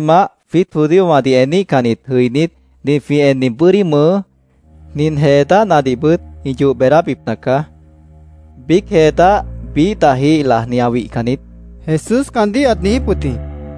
—Tʉ́ttimah, jwiít judíowãdih eníhcannit jʉinít, nin jwĩ enni bʉ́dí mʉʉ́, nin jee dáhnadihbʉt, ĩ yoh beedábipna caá. Biíc jee dáh biíh dahjih lajni ã wihcan niít, Jesús caandíh ãt niijíp wʉt jĩ.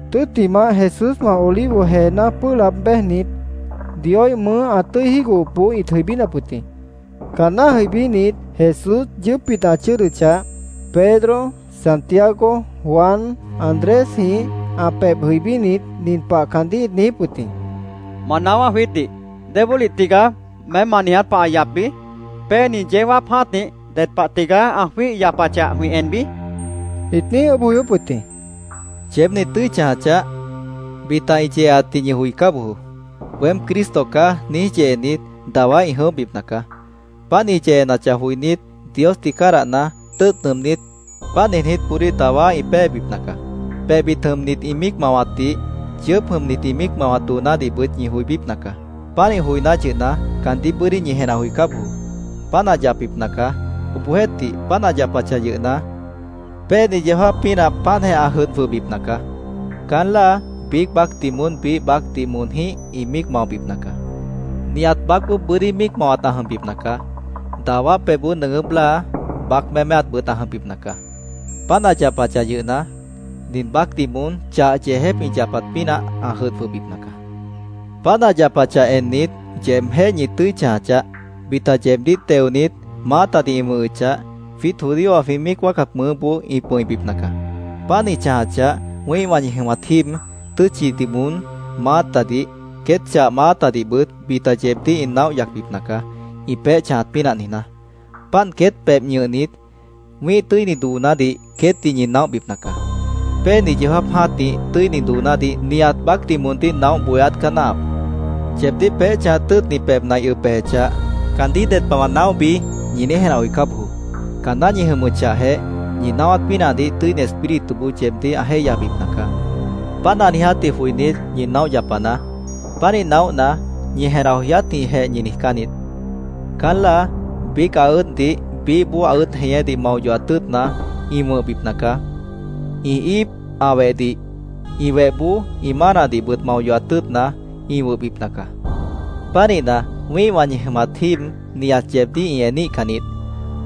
Tʉ́ttimah, Jesúswã Olivo jeená pʉ́ʉh laab béjnit, Dioíh mʉʉ́ ã tʉ́i jígohopboó ĩt jʉibínap wʉt jĩ. Caanná jʉibínit, Jesús yʉʉ́pbit ã chʉ́ʉdʉchah, Pedro, Santiago, Juan, Andrésjĩh ã pebh jʉibínit, nin pah caandíh ĩt niijíp wʉt jĩ: —Ma naáwá jwiítdih. ¿Débólih tigaá meém ma niiját pah ã yapbi? ¿Péeni yeó jáap jã́tih ded pah tigaá ã jwíih yapachah, jwĩ enbi? ĩt niíj ʉʉ́bh joyóp wʉt jĩ. —Yeéb ñi tʉ́i chãja chaáh. Bita ĩ yeeatdih ñi joicá bojoó. ‘Weém Cristo caá’, niíj yeenit, dawá ĩ jʉ̃óhbipna caá. Páant ĩ yeenachah joinít, Diosdih cádahna, tʉ́ʉt nʉʉmnít, páant niijnítboodíh dawá ĩ péebipna caá. “Pebhbit jʉmnit ĩ míic mawatdih, yʉʉ́p jʉmnit ĩ míic mawat doonádihbʉt ñi joibípna caá. Pánih joiná yʉhna, caandíh bʉ́dí ñi jenah joicá bojoó. Páant ã yapbipna caá. Obohjeéhtih, páant ã yapachah yʉhna, péeni yeó jáap pínah páantjeh ã jʉdh jwʉhbipna caá. Caán láa biíc baácdih moón biíh baácdih moonjĩ́h ĩ míic maobipna caá. Nihat baácboó bʉ́dí míic mawat ã jʉmbipna caá. Dawá pebhboó nʉʉgʉ́p láa, baác méméatbʉt ã jʉmbipna caá. Páant ã yapachah yʉhna, nin baácdih moón chah yeejép ĩ yapat pínah ã jʉdh jwʉhbipna caá. “Páant ã yapachah ennit, yeebjéh ñi tʉ́i chãja chaáh. Bita yeebdíh teonit, maátadih ĩ wʉ̃hʉchah, jwiít judíowã jwĩ míic wáacat mʉʉ́boó ĩ pʉ̃ibipna caá. Páant ĩ chãjachah, wĩ́ihwã ñi jʉmat jíib, tʉ́tchidih moón maátadih, queét chah maátadihbʉt bita yeebdíh ĩ naóh yacbipna caá, ĩ peéh chãjat pínah niijná. Páant queét pebh ñʉhnit, wĩ́ih tʉ́ini doonádih queétdih ñi naóhbipna caá. Péeni yeó jáap jã́tih tʉ́ini doonádih nihat baácdih moondíh naóh bohéát caá náahap. Yeebdíh peéh chãjat tʉ́ʉtni pebhna ĩ ʉb bejechah, ‘¿Caandíh ded pah wã naóhbi?’ ñi niíj jenah joicá bojoó. Caanná ñi jʉmʉchahjeh, ñi naáwát pínahdih Tʉ́ini Espírituboó yeebdíh ã jéihyabipna caá. Páant ã niijátdih joinít, ñi naóh yapanaá. Pánih naóhna, ñi jenah joyátjĩhjeh ñi niijcán niít. Caán láa biíc ã ʉ́ʉddih, biíhboó ã ʉ́ʉd jeñédih mao yohat tʉ́ʉtna, ĩ wʉ̃hbipna caá. Ĩ íip ã wehdih, ĩ wehboó ĩ mánadihbʉt mao yohat tʉ́ʉtna, ĩ wʉ̃hbipna caá. Pánihna, wĩ́ihwã ñi jʉmat jíib nihat yeebdíh ĩ eníhcan niít.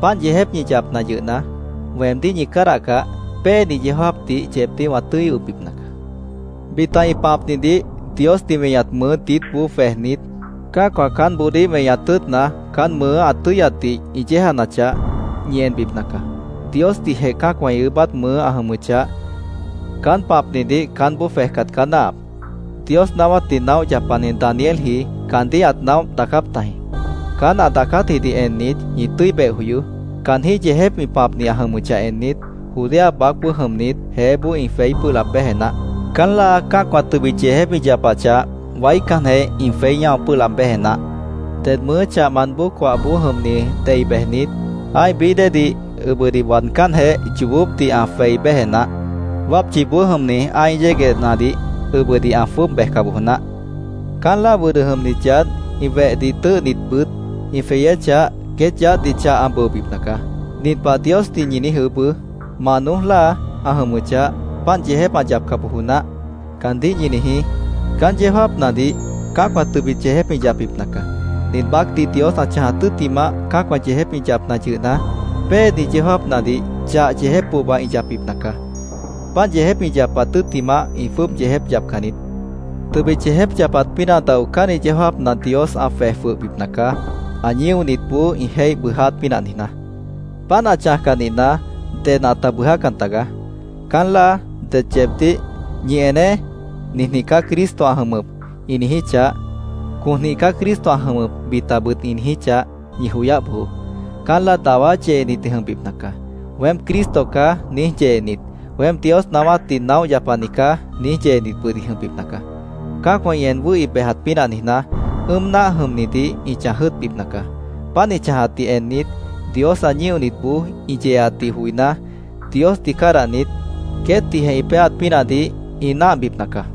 Páant yeejép ñi yapna yʉhna, weemdíh ñi cádahcah, péeni yeó jáapdih yeebdíh wã tʉ́i ʉbbipna caá. “Bita ĩ pãpnidih Diosdih weñat mʉʉ́ diítboó jwejnit, cã́acwã caánboodíh weñaat tʉ́ʉtna, caán mʉʉ́ ã tʉ́yatdih ĩ yéejanachah, ñi enbipna caá. Diosdihjeh cã́acwã ĩ ʉʉ́bát mʉʉ́ ã jʉmʉchah, caán pãpnidih caánboó jwejcat caá náahap. Dios naáwátdih naóh yapani Danielji, caandíh ãt naóh daacáp tajĩ.Caán ã daacátjidih ennit, ñi tʉ́i beh joyoó. Caanjĩ́h yeejép ĩ pãpni ã jʉmʉchah ennit, Judea baácboó jʉmnit, jeéboó ĩ jweí pʉ́ʉh laab béje naáh. Caán láa cã́acwã tʉbit yeejép ĩ yapachah, waícanjeh ĩ jweí ñáo pʉ́ʉh laab béje naáh. Ded mʉʉ́ chahmant bóo coahboó jʉmni dei bejnit, ã́ih bií déedih ʉbʉdih waadcánjeh, yoobópdih ã jwei béje naáh. Wápchiboó jʉmni ã́ih yéguehnadih ʉbʉdih ã jwʉ́ʉb bejca bojo naáh. Caán láa wʉdʉ jʉmnit yaádh, ĩ wehdih tʉ́ʉhnitbʉt ĩ jweyéchah, queét yaádhdih chah ã bʉobipna caá. Nin pah Diosdih ñi niíj ʉʉ́bʉ́: ‘Mah noój láa ã jʉmʉchah, páant yeejép ã yapca bojo naáh’, caandíh ñi niijí. Caán yeó jáapnadih cã́acwã tʉbit yeejép ĩ yapbipna caá. Nin baácdih Dios ã chãjat tʉ́ttimah, cã́acwã yeejép ĩ yapna yʉhna, péeni yeó jáapnadih chah yeejép pohba ĩ yapbipna caá. Páant yeejép ĩ yapat tʉ́ttimah, ĩ jwʉ́ʉb yeejép yapcan niít. Tʉbit yeejép yapat pínah daocánni yeó jáapna Dios ã jwej jwʉhbipna caá, ã ñíonitboó ĩ jéih bʉʉjáát pínah niijná. Páant ã chãjcah nihna, ded ãta bʉʉjácan tagaá. “Caán láa det yeebdíh ‘Ñi eneé. Ninjĩh caá Cristo ã jʉmʉp’, ĩ niijíchah, ‘Conjĩh caá Cristo ã jʉmʉp’, bitabʉt ĩ niijíchah, ñi joyáh bojoó. Caán láa dawá yeenit ĩ jʉmbipna caá. ‘Weém Cristo caá’, niíj yeenit, ‘Weém Dios naáwátdih naóh yapani caá’, niíj yeenitbʉt ĩ jʉmbipna caá. Cã́acwã ĩ en wʉ́hi bejat pínah niijná, ʉ́ʉm náah jʉmnidih ĩ chãj jʉ́ʉtbipna caá. Páant ĩ chãjatdih ennit, Dios ã ñíonitboó ĩ yeeatdih joiná, Diosdih cádahnit, queétdihjeh ĩ péeat pínahdih ĩ náahbipna caá.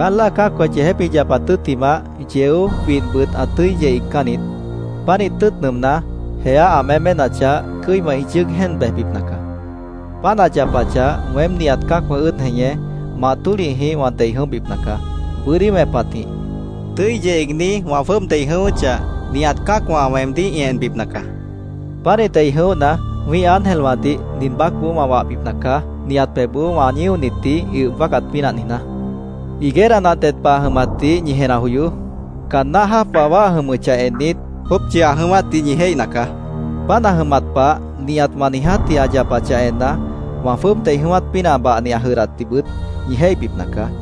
“Caán láa cã́acwã yeejép ĩ yapat tʉ́ttimah, yeó, widhbʉt ã tʉ́i yeh iigcán niít. Pánih tʉ́ʉt nʉʉmná, jeá ã méménachah, cʉ́iwã ĩ yʉ́ʉg jéen bejbipna caá. Páant ã yapachah, weém nihat cã́acwã ʉ́ʉd jeñé, mah tólihjih wã dei jʉ̃óhbipna caá. Bʉ́dí wẽpatjĩh, tʉ́i yeh iigní wã jwʉ́ʉb dei jʉ̃ʉ́wʉ́chah, nihat cã́acwã weemdíh ĩ enbipna caá. Pánih dei jʉ̃óhna, wĩ́ih ángelwãdih nin baácboó wã wahbipna caá, nihat pebhboó wã ñíonitdih ĩ ʉb wáacat pínah niijná. “Higuera nah ded pah ã jʉmatdih ñi jenah joyoó. Caan náh jáap wawá ã jʉmʉchah ennit, jópchi ã jʉ̃ʉ́wátdih ñi jéihna caá. Páant ã jʉmat pah, nihat wã niijátji ã yapachah enna, wã jwʉ́ʉb dei jʉ̃ʉ́wát pínah bahni ã jʉdhdatdihbʉt ñi jéihbipna caá.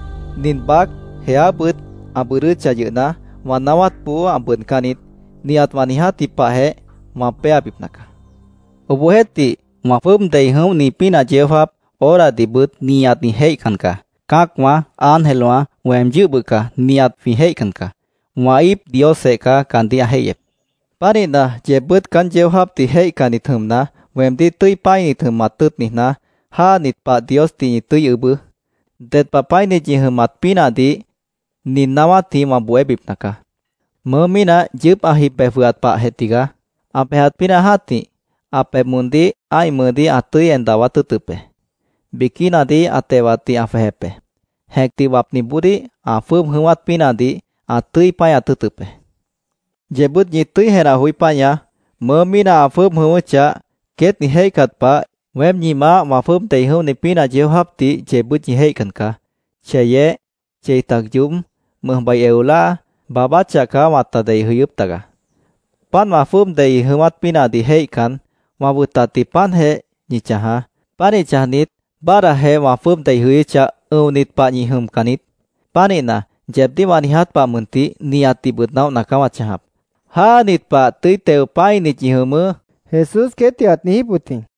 Nin baác, jeábʉt ã bʉʉdʉ́chah yʉhna, wã naáwátboó ã bʉʉdcán niít. Nihat wã niijátji pahjeh wã péabipna caá. “Obohjeéhtih, wã jwʉ́ʉb dei jʉ̃óhni pínah yeó jáap, horadihbʉt nihat ĩ jéihcan caá. Cã́acwã, ángelwã, weem yʉ́h bʉca nihat jwĩ jéihcan caá. Wã íip Diosjeh caá caandíh ã jéihyep. “Pánihna, yeebbʉ́t caán yeó jáapdih jéihcannit jʉmna, weemdíh tʉ́i pã́init jʉmat tʉ́ʉt niijná, jáanit pah Diosdih ñi tʉ́i ʉʉ́bʉ́. Ded pah pã́init ñi jʉmat pínahdih nin naáwátjĩh wã bohébipna caá: Mʉʉ́ mínah yʉʉ́p ã jib bej jwʉhat pahjeh tigaá. Ã bejat pínah jã́tih, ã pebh moondíh ã́ih mʉʉdíh ã tʉ́i en dawát tʉ́ʉtʉp be. Biquínadih ã tewatdih ã jwejep be. Jẽcdih wapniboodíh ã jwʉ́ʉb jʉ̃ʉ́wát pínahdih ã tʉ́i páñat tʉ́ʉtʉp be. Yeebbʉ́t ñi tʉ́i jenah joí páñaá. Mʉʉ́ mínah ã jwʉ́ʉb jʉ̃ʉ́wʉ́chah, queét ĩ jéihcat pah, weém ñi Maáh wã jwʉ́ʉb dei jʉ̃óhni pínah yeó jáapdih yeebbʉ́t ñi jéihcan caá. Cheyeh, chei tac yoób, mʉjbai eo láa, baabáchah caá wãta dei jʉyʉ́p tagaá. Páant wã jwʉ́ʉb dei jʉ̃ʉ́wát pínahdih jéihcan, wã wʉtatdih páantjeh ñi chãjaá. Pánih chãjnit, báadhdajeh wã jwʉ́ʉb dei jʉyʉ́chah, ʉ̃onit pah ñi jʉmcan niít. Pánihna, yeebdíh wã niiját pah mʉntih, nihatdihbʉt naóhna caá wã chãjap: ¡Jáanit pah, tʉ́i teo pã́init ñi jʉmʉʉ́!” Jesús queétdih ãt niijíp wʉt jĩ.